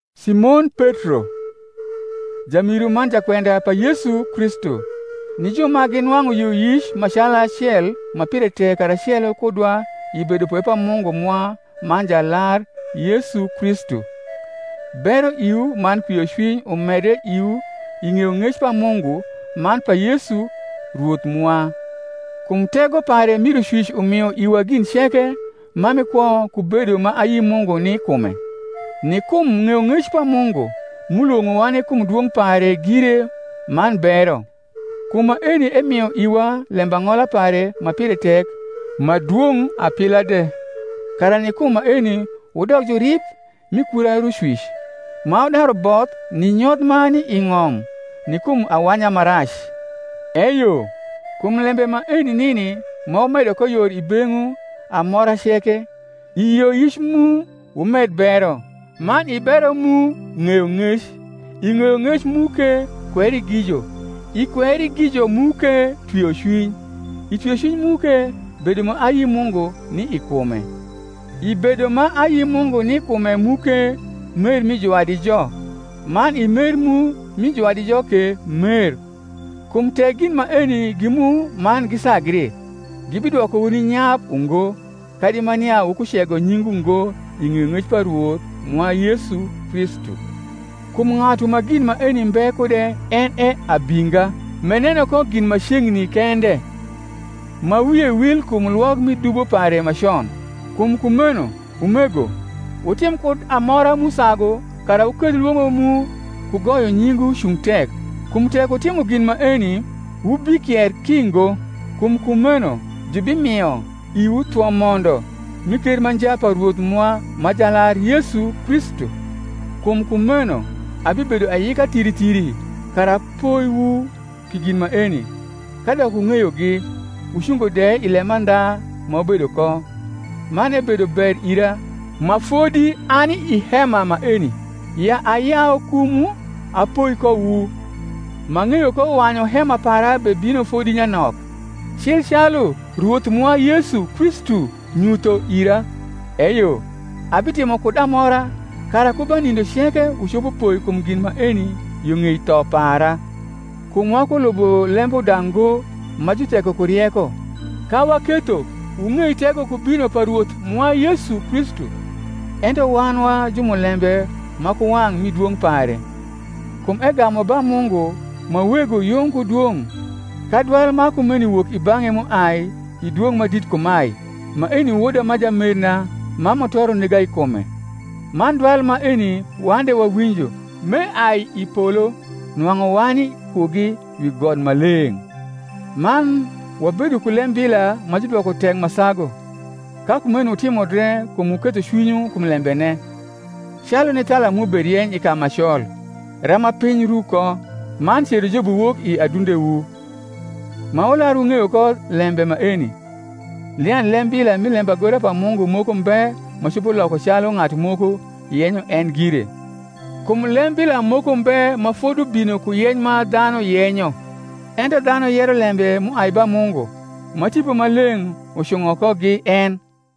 Simon Petro, jarniru man jakwenda pa Yesu Kristu, ni ju ma ginwang’u yioyic ma calacel ma pire tek karacelo kudwa i bedopwe pa Mungu mwa man Jalar Yesu Kristu: Bero iwu man kwiocwiny umedre iwu i ng’eyong’ec pa Mungu man pa Yesu Rwoth mwa. Kum tego pare mi Rucwic umio iwa gin ceke ma mi kwo ku bedo ma ayi Mungu ni kume, ni kum ng’eyong’ec pa Mungu m’ulwong’owa ni kum dwong’ pare gire man bero; kum maeni emio iwa lembang’ola pare ma pire tek ma dwong’ apila de; kara ni kum maeni wudok jurib mi kura Rucwic, ma wudaru both ni nyoth ma ni i ng’om ni kum awanya ma rac. Eyo, kum lembe maeni nini ma wumedo ko yor i beng’wu amora ceke, i yioyic mu wumed bero; man i bero mu ng’eyong’ec; i ng’eyong’ec mu ke kwerigijo; i kwerigijo mu ke twiocwiny; i twiocwiny mu ke bedo ma ayi Mungu ni i kume; i bedo ma ayi Mungu ni kume mu ke mer mi juwadijo; man i mer mu rni juwadijo ke mer. Kum tek gin maeni gi mu man gisagri, gibidwokowu ni nyap ungo kadi ma nia wukucego nyingwu ngo i ng’eyong’ec pa Rwoth mwa Yesu Kristu. Kum ng’atu ma gin maeni mbe kude en e abinga, m’eneno ko gin ma ceng’ni kende, ma wie wil kum lwok mi dubo pare ma con. Kum kumeno, umego, wutim kud amora m’usagu kara wuketh lwong’o mu ku goyo nyingwu cung tek: kum tek wutimo gin maeni, wubikier ki ngo: kum kumeno jubimio iwu thwo mondo m’i ker ma nja pa Rwoth mwa ma Jalar Yesu Kristu. Kum kumeno abibedo ayika thiri thiri kara apoiwu pi gin maeni, kadok wung’eyogi, wucungo de i lemandha ma wubedo ko. Man ebedo ber ira, ma fodi ani i hema maeni, ya ayau kumwu apoi kowu; m’ang’eyo ko wanyu hema para bebino fodi nyanok, cil calu Rwoth mwa Yesu Kristu nyutho ira. Eyo, abitimo kud amora kara ku ba nindo ceke wucopo poi kum gin maeni yo ng’ei tho para. Kum wakulubo lembuda ngo ma jutheko ku rieko, ka waketho wung’ei tego ku bino pa Rwoth mwa Yesu Kristu, ento wan wa jumulembe ma ku wang’ mi dwong’ pare. Kum egamu ba Mungu ma Wego yung ku dwong’, ka dwal ma kumeni wok i bang’e m’uai i Dwong’ Madit kumae, Maeni Woda ma jamerna. ma mutoro nega i kume: man dwal maeni wan de wawinjo m’eai i polo. nwang’u wani kugi wi got ma leng’. Man wabedo ku lembila ma judwoko tek ma sagu; ka kumeno wutimo dre kum wuketho cwinywu kum lembene, calu ni thala m’uberieny i ka ma col, rama piny ru ko, man cerojobi wok i adundewu: ma wular wung’eyo ko lembe maeni, nia lembila mi lembagora pa Mungu moko mbe ma copo loko calu ng’atu moko yenyo en gire. Kum lembila moko mbe ma fodubino ku yeny ma dhanu yenyo: ento dhanu yero lembe m’uai ba Mungu, ma Tipo Maleng’ ucung’o kogi en.